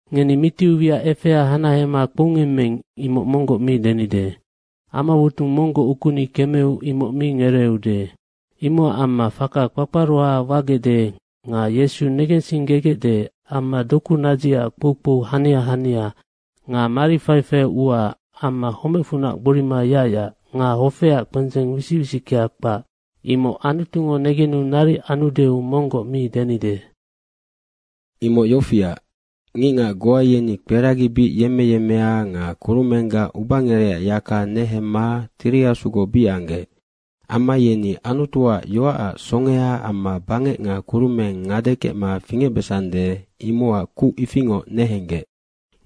Ngeni mitiu wiac efea hanahema kpoungemmeing imoc monggoc mi denide. Amawotung monggoc ukuni kemeu imoc mi ngereeude. Imocac amma faka kpakparoha wagecde nga Yesu negensinggegecde amma doku nadzicac kpoukpou hania hania nga mari faifaiac ua amma homecfunac gborima yacyac nga hofeac kpendzeng wisic wisickea kpac, imoc Anutungo negenu naric anudeu monggoc mi denide. Imoc yofiac, ngicngac goa yeni kperagi bic yemmeyemmea nga kurumenggac ubangerecac yaka nehemma Tiri Asugoc bic anggec. Amma yeni Anutuac yoacac songea amma bangec nga kurumeng ngade kecma fingecbesande, imocac kuc ifingoc nehenggec.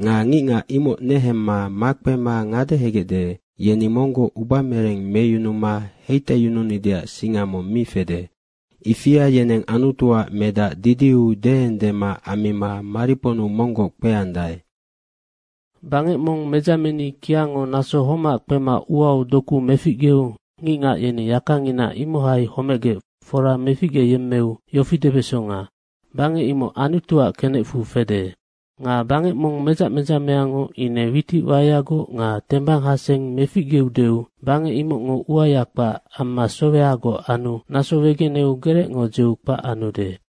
Nga ngicngac imoc nehemma makpema ngadehegecde, yeni monggoc ubamereng meyunuma heitaiyununideac singa mong mi fede. Ifia yeneng Anutuac Medac didiu deengdema ammima mariponnu monggoc kpeandae. Bangec mong medzameni kiango naso homac kpema uau doku meficgeu ngicngac yeni yakangina imohai homecgec fora meficgeyemmeu yofi debesonga, bangec imoc Anutuac kenecfu fede. Nga bangec mong medzac medzameango ine witic waeagoc nga tebanghaseng meficgeudeu bangec imocngo uaya kpac amma sowehagoc anu naso wegeneu gerecngo dzeu kpac anude.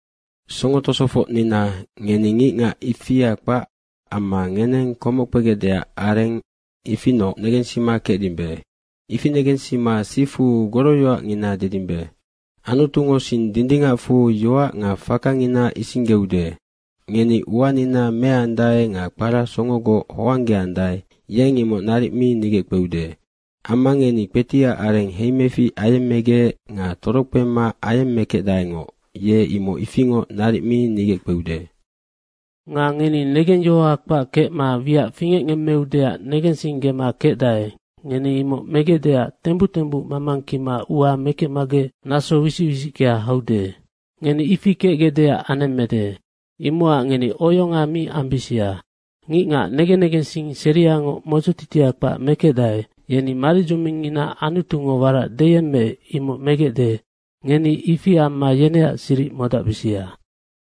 Songo tosofocnina, ngeni ngicngac ifia kpac amma ngeneng komoc kpegecdeac areng, ifinoc negensima kecdimbe. Ifi negensima sifu goroyoacngina dedimbe. Anutungo sing dindingacfu yoac nga fakangina isinggeude. Ngeni uanina meandae nga kpara songogoc hoanggeandae, yeng imoc naric mi nigeckpeude. Amma ngeni kpetiac areng heimefic ayemmegec nga torokpema ayemmekecdaengoc, ye imoc ifingoc naric mi nigeckpeude. Nga ngeni negengyohoha kpac kecma wiac fingecngemmeudeac negensinggema kecdae, ngeni imoc megecdeac tembuc tembuc mamangkima ua mekecmagec naso wisic wisickea haude. Ngeni ifi kecgecdeac anemmede. Imocac ngeni oyonga mi ambisia. Ngicngac negen negensing seriangoc modzotitia kpac mekecdae, yeni maridzomingngina Anutungo warac deyemmeec, imoc megecde, ngeni ifi amma yeneac siric modacbisia.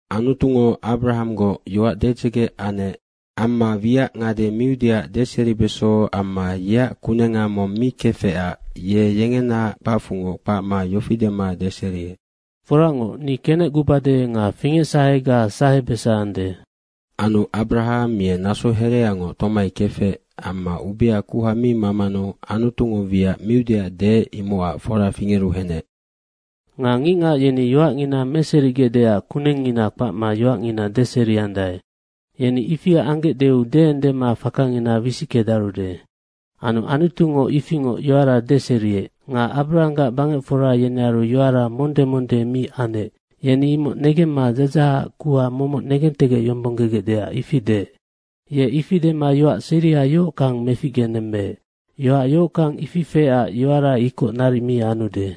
Anutungo Abarahanggoc yoac dedzege anec. Amma wiac ngade miudeac deseribeso amma yeac kunenga mong mi kefecac ye yengenaac kpacfungoc kpacma yofi dema deseriec, “Foracngoc, ni kenecgubade nga fingecsahega sahebesande.” Anu Abarahang ye naso hereangoc tomai kefec. Amma ubea kuha mi mamanu Anutungo wiac miudeac deec, imocac fora fingeru henec. Nga ngicngac yeni yoacngina meserigecdeac kunengngina kpacma yoacngina deseriandae. Yeni ifi anggecdeu deengdema fakangina wisickedarude. Anu Anutungo ifingoc yoara deseriec. Nga Abrahanggac bangecfora yenearu yoara monde monde mi anec, yeni imoc negemma dzadzahac kuha momoc negentegecyombonggegecdeac ifi deec. Ye ifi dema yoac seria yohockang meficgenemmeec. Yoac yohockang ifi feecac yoara ikoc naric mi anude.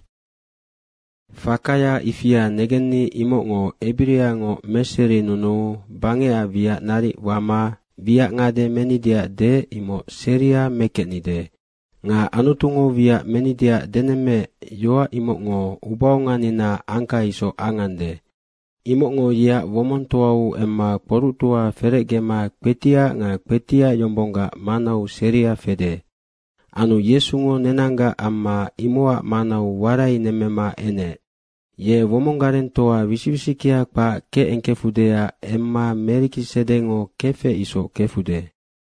Fakaya ifia negenni imocngo ebiriangoc meserinunuu bangecac wiac naric wama wiac ngade menideac deec, imoc seria mekecnide. Nga Anutungo wiac menideac denemmeec, yoac imocngo ubaonganinaac angka isoc angande. Imocngo yeac womongtoau emma kpoructoa ferecgema kpetiac nga kpetiac yombonggac manau seria fede. Anu Yesungo nenanggac amma imocac manau warainemmema enec. Ye womong garengtoa wisic wisickea kpac kecengkefudeac emma Merikisedengo kefec isoc kefude.